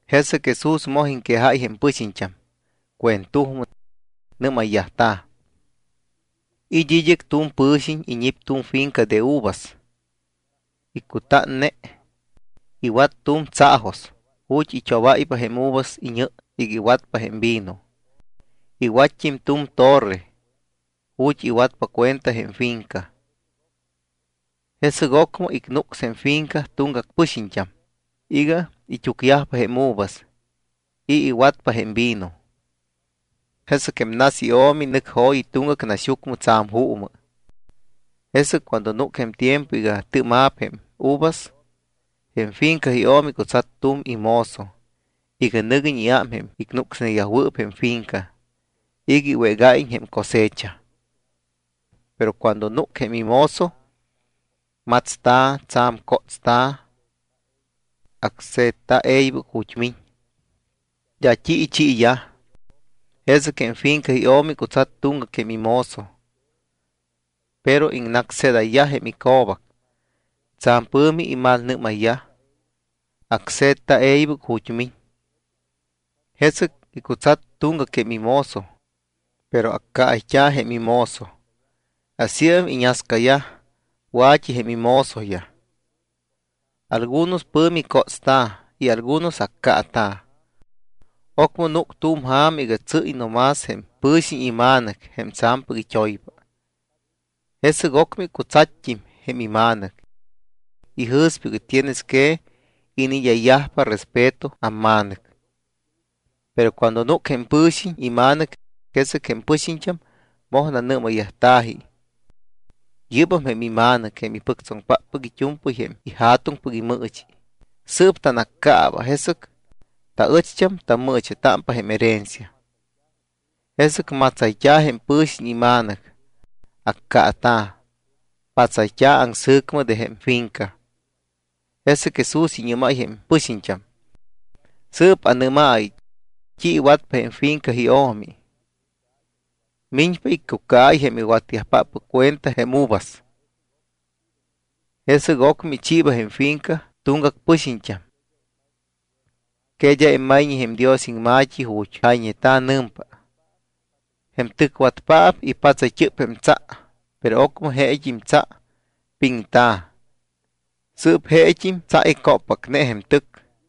Jesɨc Jesús moj iŋquejáy jém pɨxiñt́am cuentujmɨ. Nɨ́mayyajta̱: —It́ id́ɨc tu̱m pɨ̱xiñ iñip tu̱m finca de uvas. Icutánne. Iwat tu̱m tsaajos ju̱t́ it́obáypa jém uvas iñɨ iga iwatpa jém vino. Iwatt́im tu̱m torre ju̱t́ iwatpa cuenta jém finca. ’Jesɨc ocmɨ icnucs jém ifinca tuŋgac pɨxiñt́am iga it́úcyajpa jém uvas y iwatpa jém vino. Jesɨc jém nas io̱mi nɨc jo̱yi tuŋgac naxyucmɨ tsa̱m juumɨ. Jesɨc cuando núc jém tiempo iga tɨɨma̱p jém uvas, jém finca io̱mi icutsat tu̱m imozo iga nɨguiñ iám jém icnucsneyajwɨɨp jém ifinca iga iwégáyiñ jém cosecha. Pero cuando núc jém imozo, matsta̱, tsa̱m cótsta̱. Acse̱tta̱ e̱ybɨc ju̱t́ miñ. D́a t́i ichiiyaj. Jesɨc jém finca io̱mi icutsat tuŋgac jém imozo. Pero iŋnácsjedayyaj jém ico̱bac. Tsa̱m pɨ̱mi imalmalnɨ́mayyaj. Acse̱tta̱ e̱ybɨc ju̱t́ miñ. Jesɨc icutsat tuŋgac jém imozo, pero accaayt́a̱ jém imozo. Asíam iñascayaj wa̱t́i jém imozoyaj. Algunos pɨ̱mi cótsta̱ y algunos accaata̱. ’Ocmɨ núc tu̱m ja̱ma iga tsɨ́y no más jém pɨ̱xiñ ima̱nɨc jém tsa̱mpɨc it́oypa. Jesɨc ocmɨ icutsatt́im jém ima̱nɨc. Ijɨ̱spa: “Tienes que iniid́ayyajpa respeto amma̱nɨc.” Pero cuando núc jém pɨ̱xiñ ima̱nɨc, jesɨc jém pɨxiñt́am moj nanɨ́mayyajta̱ji: “Yɨ́bam jém ima̱nɨc jém ipɨctsoŋpáppɨc it́u̱mpɨy jém ija̱tuŋpɨc imɨɨchi. Sɨɨp tanaccaaba, jesɨc taɨcht́am tammɨɨcha̱támpa jém herencia.” Jesɨc matsayt́a̱ jém pɨ̱xiñ ima̱nɨc, accaata̱, patsayt́a̱ aŋsɨ̱cmɨ de jém finca. Jesɨc Jesús iñɨ́máy jém pɨxiñt́am: —Sɨɨp anɨ́maayɨ: ¿T́i iwatpa jém finca io̱mi? Miñpa iccucaáy jém iwatyajpáppɨc cuenta jém uvas. Jesɨc ocmɨ ichiiba jém finca tuŋgac pɨxiñt́am. ’¿Que d́a immayñe jém Dios iŋma̱t́i ju̱t́ jayñeta̱? Nɨmpa: Jém tɨcwatpaap ipatsayt́ɨp jém tsa. Pero ocmɨ jeet́im tsa piŋta̱. Sɨɨp jeet́im tsa icóppacne jém tɨc.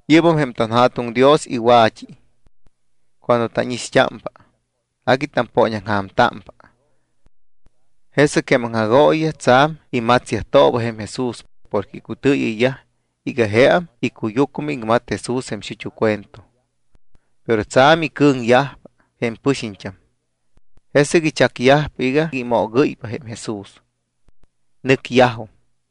Yɨ́bam jém tanJa̱tuŋ Dios iwa̱t́i. Cuando tánixt́ámpa, agui tampooñaŋja̱mtámpa. Jesɨc jém aŋjagooyiyaj tsa̱m imatsyajtooba jém Jesús porque icutɨɨyɨyyaj iga jeam icuyucmɨ iŋmat Jesús jém xut́u cuento. Pero tsa̱m icɨ̱ŋyajpa jém pɨxiñt́am. Jesɨc ichacyajpa iga imoogɨ́ypa jém Jesús. Nɨcyajum.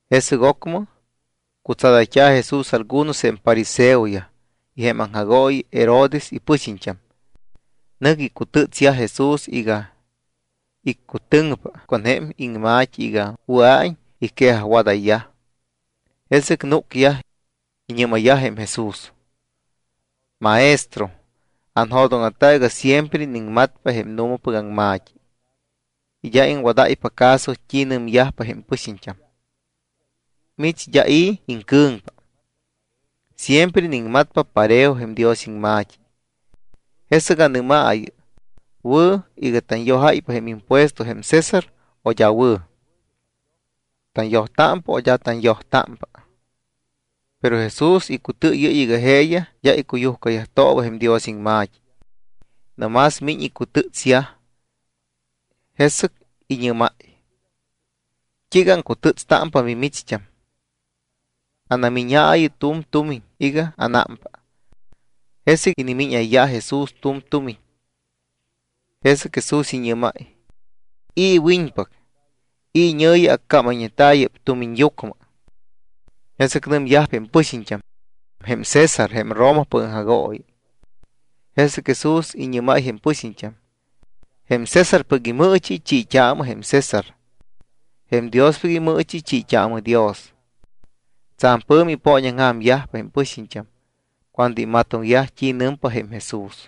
Jesɨc ocmɨ cutsadayt́a̱ Jesús algunos jém fariseoyaj y jém aŋjagooyi Herodes ipɨxiñt́am. Nɨc icutɨ́tsta̱ Jesús iga iccutɨŋpa con jém iŋma̱t́i iga wɨa̱iñ iquejajwadayyaj. Jesɨc núcyaj iñɨ́mayyaj jém Jesús: —Maestro, anjo̱dóŋa̱ta iga siempre iniŋmatpa jém nu̱mapɨc aŋma̱t́i y d́a iŋwadáypa caso t́i nɨmyajpa jém pɨxiñt́am. Mich d́a i̱ iŋcɨ̱ŋpa. Siempre iniŋmatpa parejo jém Dios iŋma̱t́i. Jesɨc anɨ́maayɨ, ¿wɨ̱ iga tanyojpa jém impuesto jém César o d́a wɨ̱? ¿Tanyojtámpa o d́a tanyojtámpa? Pero Jesús icutɨɨyɨ́y iga jeeyaj d́a icuyujcatooba jém Dios iŋma̱t́i, no más miñ icutɨ́ts. Jesɨc iñɨ́máy: —¿T́iiga aŋcutɨ́tstámpa mimicht́am? Anamíñaayɨ tu̱m tumiñ iga ánámpa. Jesɨc inimíñayyaj Jesús tu̱m tumiñ. Jesɨc Jesús iñɨ́máy: —¿I̱ iwiñpac, i̱ iñɨ̱yi accámayñeta̱ yɨ́p tumiñyucmɨ? Jesɨc nɨmyajpa jém pɨxiñt́am: —Jém César jém Romapɨc aŋjagooyi. Jesɨc Jesús iñɨ́máy jém pɨxiñt́am: —Jém Césarpɨc imɨɨchi, chiit́aamɨ jém César. Jém Diospɨc imɨɨchi, chiit́aamɨ Dios. Tsa̱m pɨ̱mi ipooñaŋja̱myajpa jém pɨxiñt́am cuando imatoŋyaj t́i nɨmpa jém Jesús.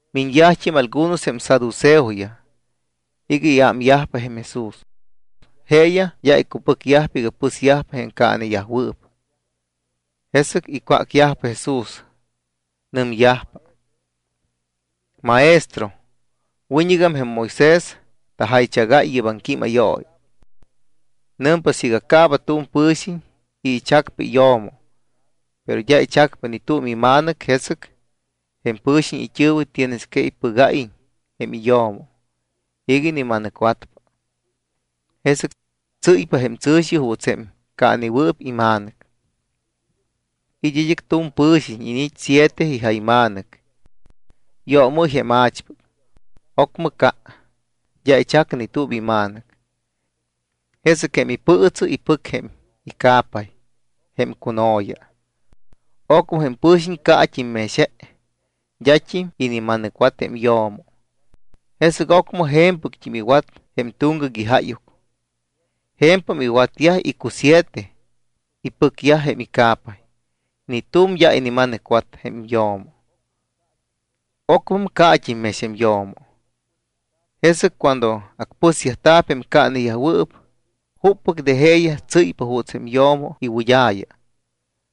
Miñyajt́im algunos jém saduceoyaj iga iámyajpa jém Jesús. Jeeyaj d́a icupɨcyajpa iga pɨsyajpa jém caaneyajwɨɨp. Jesɨc icwácyajpa Jesús. Nɨmyajpa: —Maestro, wiñɨgam jém Moisés tajaychagáy yɨ́p aŋquímayooyi. Nɨmpa siiga caaba tu̱m pɨ̱xiñ y ichacpa iyo̱mo, pero d́a ichac ni tu̱m ima̱nɨc, jesɨc jém pɨ̱xiñ it́ɨ̱wɨ tienes que ipɨgáyiñ jém iyo̱mo iga inima̱nɨcwatpa. Jesɨc tsɨ́ypa jém tsɨ̱xi juuts jém caanewɨɨp ima̱nɨc. It́ id́ɨc tu̱m pɨ̱xiñ, iniit́ siete ijayma̱nɨc. Yoomɨ́y jém más a̱chpɨc. Ocmɨ ca, d́a ichac ni tu̱m ima̱nɨc. Jesɨc jém ipɨɨtsɨ ipɨc jém ica̱pay, jém cuno̱ya. Ocmɨ jém pɨ̱xiñ caat́im mex je. D́at́im inima̱nɨcwat jém yo̱mo. Jesɨc ocmɨ je̱mpɨct́im iwat jém tuŋgac ijáyuc. Je̱mpam iwatyaj icusiete, ipɨcyaj jém ica̱pay, ni tu̱m d́a inima̱nɨcwat jém yo̱mo. Ocmɨm caat́im mex jém yo̱mo. Jesɨc cuando acpɨsyajta̱p jém caaneyajwɨɨp, ¿juppɨc de jeeyaj tsɨ́ypa juuts jém yo̱mo iwɨd́a̱ya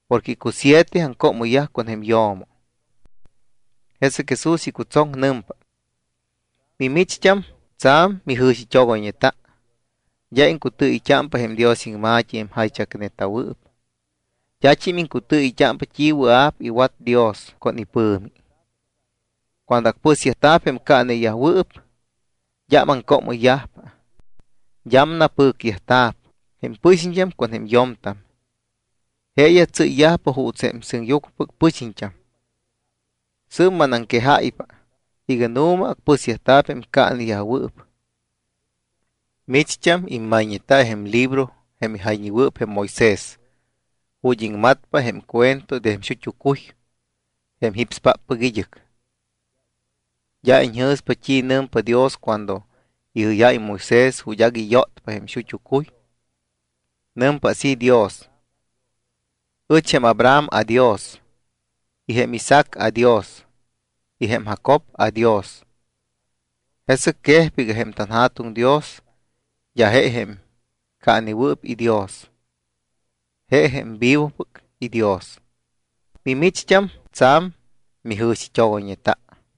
porque icusiete aŋcoomɨyyaj con jém yo̱mo? Jesɨc Jesús icutsoŋ, nɨmpa: —Mimicht́am tsa̱m mijɨ̱xit́ogoyñeta. D́a iŋcutɨɨyɨyt́ámpa jém Dios iŋma̱t́i jém jaychacneta̱wɨɨp. D́at́im iŋcutɨɨyɨyt́ámpa t́i wɨa̱p iwat Dios con ipɨ̱mi. Cuando acpɨsyajta̱p jém caaneyajwɨɨp, d́am aŋcoomɨyyajpa. D́am napɨcyajta̱p jém pɨxiñt́am con jém yo̱mtam. Jeeyaj tsɨ́yyajpa juuts jém sɨŋyucmɨpɨc pɨxiñt́am. Sɨɨp manaŋquejáypa iga nu̱ma acpɨsyajta̱p jém caaneyajwɨɨp. Micht́am immayñeta jém libro jém ijayñewɨɨp jém Moisés ju̱t́ iŋmatpa jém cuento de jém xut́u cuy jém jípspáppɨc id́ɨc. D́a iñjɨ̱spa t́i nɨmpa Dios cuando ijɨ́yáy jém Moisés ju̱t́ agui yótpa jém xut́u cuy. Nɨmpa así Dios: “Ɨch jém Abraham aDios, y jém Isaac aDios, y jém Jacob aDios.” Jesɨc quejpa iga jém tanJa̱tuŋ Dios d́a je jém caanewɨɨp iDios, je jém vivopɨc iDios. Mimicht́am tsa̱m mijɨ̱xit́ogoyñeta.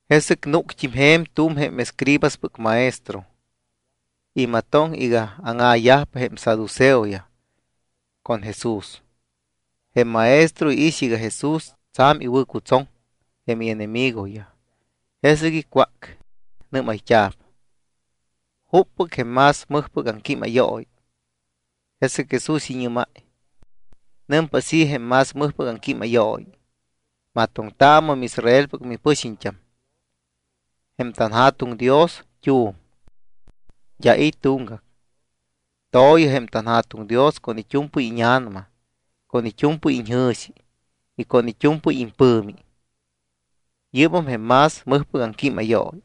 Jesɨc núct́im je̱m tu̱m jém escribaspɨc maestro. Imatoŋ iga áŋa̱yajpa jém saduceoyaj con Jesús. Jém maestro iix iga Jesús tsa̱m iwɨ̱cutsoŋ jém ienemigoyaj, jesɨc icwác. Nɨ́mayt́a̱p: —¿Juppɨc jém más mɨjpɨc aŋquímayooyi? Jesɨc Jesús iñɨ́máy: —Nɨmpa así jém más mɨjpɨc aŋquímayooyi: “Matoŋtaamɨ miIsraelpɨc mipɨxiñt́am. Jém tanJa̱tuŋ Dios t́u̱m. D́a i̱ tuŋgac. To̱yɨ jém tanJa̱tuŋ Dios con it́u̱mpɨy íña̱nama, con it́u̱mpɨy iñjɨ̱xi y con it́u̱mpɨy impɨ̱mi.” Yɨ́bam jém más mɨjpɨc aŋquímayooyi.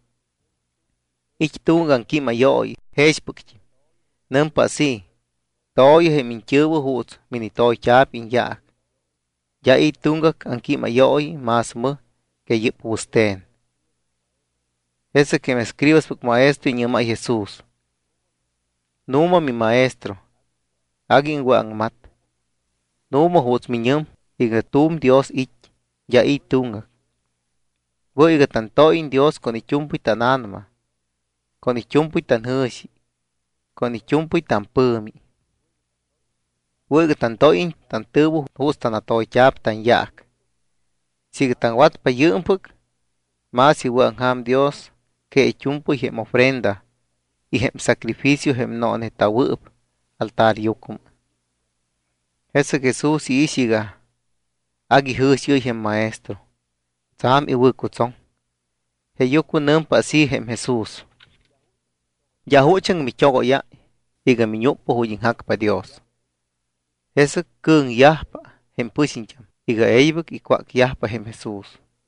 It́ tuŋgac aŋquímayooyi jexpɨct́im. Nɨmpa así: “To̱yɨ jém iñt́ɨ̱wɨ juuts minitoyt́a̱p iñyaac.” D́a i̱ tuŋgac aŋquímayooyi más mɨj que yɨ́p wɨste̱n. Jesɨc jém escribaspɨc maestro iñɨ́máy Jesús: —Nu̱ma, miMaestro, agui iŋwɨ̱aŋmat. Nu̱ma juuts miñɨm iga tu̱m Dios it́, d́a i̱ tuŋgac. Wɨ̱ iga tantóyiñ Dios con it́u̱mpɨy tána̱nama, con it́u̱mpɨy tanjɨ̱xi y con it́u̱mpɨy tampɨ̱mi. Wɨ̱ iga tantóyiñ tantɨ̱wɨ juuts tanatoyt́a̱p tanyaac. Siiga taŋwatpa yɨɨmpɨc, más iwɨ̱aŋja̱m Dios que it́u̱mpɨy jém ofrenda y jém sacrificio jém nooneta̱wɨɨp altaryucmɨ. Jesɨc Jesús iix iga agui jɨ̱xiɨ́y jém maestro. Tsa̱m iwɨ̱cutsoŋ. Jeeyucmɨ nɨmpa así jém Jesús: —D́a juchaŋ mit́ogóyáy iga miñúcpa ju̱t́ iŋjacpa Dios. Jesɨc cɨ̱ŋyajpa jém pɨxiñt́am iga e̱ybɨc icwácyajpa jém Jesús.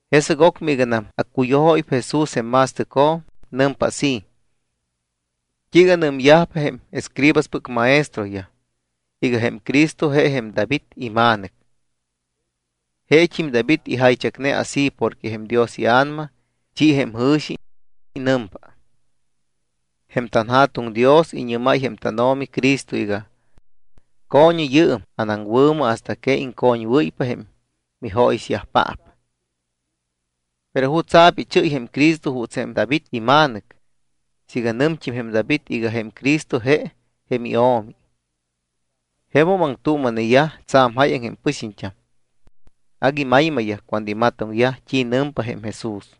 Jesɨc ocmɨ iganam accuyujóypa Jesús jém ma̱stɨcjo̱m, nɨmpa así: —¿T́iiga nɨmyajpa jém escribaspɨc maestroyaj iga jém Cristo je jém David ima̱nɨc? Jeet́im David ijaychacne así porque jém Dios iA̱nama ichi jém jɨ̱xi. Nɨmpa: Jém tanJa̱tuŋ Dios iñɨ́máy jém tánO̱mi Cristo iga: “Co̱ñɨ yɨɨm anaŋwɨ̱mɨ hasta que iŋcoñwɨ́ypa jém mijóyixyajpaap.” ¿Pero jutsa̱p ichɨ́y jém Cristo juuts jém David ima̱nɨc siiga nɨmt́im jém David iga jém Cristo je jém iO̱mi? Jemum aŋtuuma̱neyaj tsa̱m jáyaŋ jém pɨxiñt́am. Agui maymayyaj cuando imatoŋyaj t́i nɨmpa jém Jesús.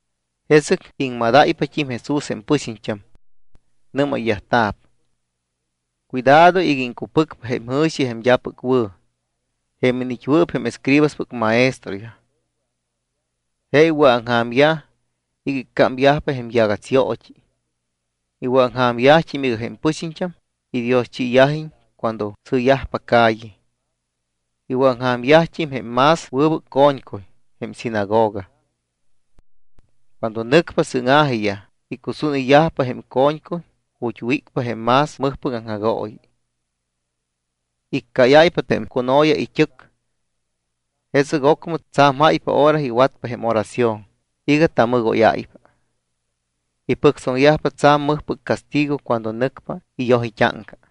Jesɨc iŋmadáypat́im Jesús jém pɨxiñt́am. Nɨ́mayyajta̱p: —Cuidado iga iŋcupɨcpa jém jɨ̱xi jém d́apɨc wɨ̱ jém iniit́wɨɨp jém escribaspɨc maestroyaj. Je iwɨ̱aŋja̱myaj iga iccámyajpa jém yagatsyoot́i. Iwɨ̱aŋja̱myajt́im iga jém pɨxiñt́am idioschiyajiñ cuando sɨɨyajpa calle. Iwɨ̱aŋja̱myajt́im jém más wɨbɨc co̱ñcuy jém sinagoga. Cuando nɨcpa sɨ́ŋa̱jiyaj, icusúnɨyyajpa jém co̱ñcuy ju̱t́ wícpa jém más mɨjpɨc aŋjagooyi. Iccáyáypa jém cuno̱ya it́ɨc. Jesɨc ocmɨ tsa̱m jáypa hora iwatyajpa jém oración iga tamɨgóyáypa. Ipɨctsoŋyajpa tsa̱m mɨjpɨc castigo cuando nɨcpa iyoj it́áŋca.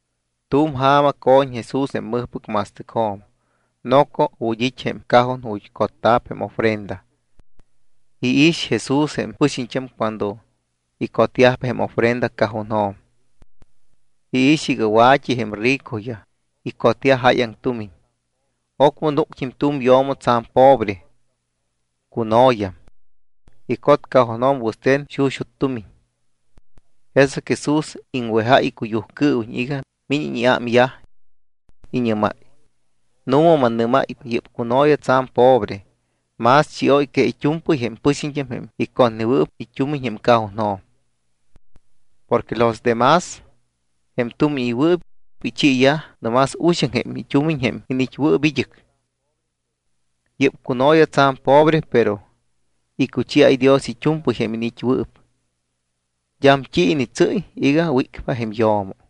Tu̱m ja̱ma co̱ñ Jesús jém mɨjpɨc ma̱stɨcjo̱m noco ju̱t́ it́ jém cajon ju̱t́ cotta̱p jém ofrenda. Iix Jesús jém pɨxiñt́am cuando icotyajpa jém ofrenda cajonjo̱m. Iix iga wa̱t́i jém ricoyaj, icotyaj jáyaŋ tumiñ. Ocmɨ núct́im tu̱m yo̱mo tsa̱m pobre. Cuno̱yam. Icot cajonjo̱m wɨste̱n xuxut́ tumiñ. Jesɨc Jesús iŋwejáy icuyujcɨɨwiñ iga míñiñ iámyaj. Iñɨ́máy: —Nu̱ma mannɨ́máypa, yɨ́p cuno̱ya tsa̱m pobre más chióy que it́u̱mpɨy jém pɨxiñt́am jém icotneyajwɨɨp it́umiñ jém cajonjo̱m. Porque los de más, jém tumiñɨywɨɨp, ichiiyaj no más uxaŋ jém it́umiñ jém iniit́wɨɨp id́ɨc. Yɨ́p cuno̱ya tsa̱m pobre, pero icuchiáy Dios it́u̱mpɨy jém iniit́wɨɨp. D́am t́i initsɨ́y iga wícpa jém yo̱mo.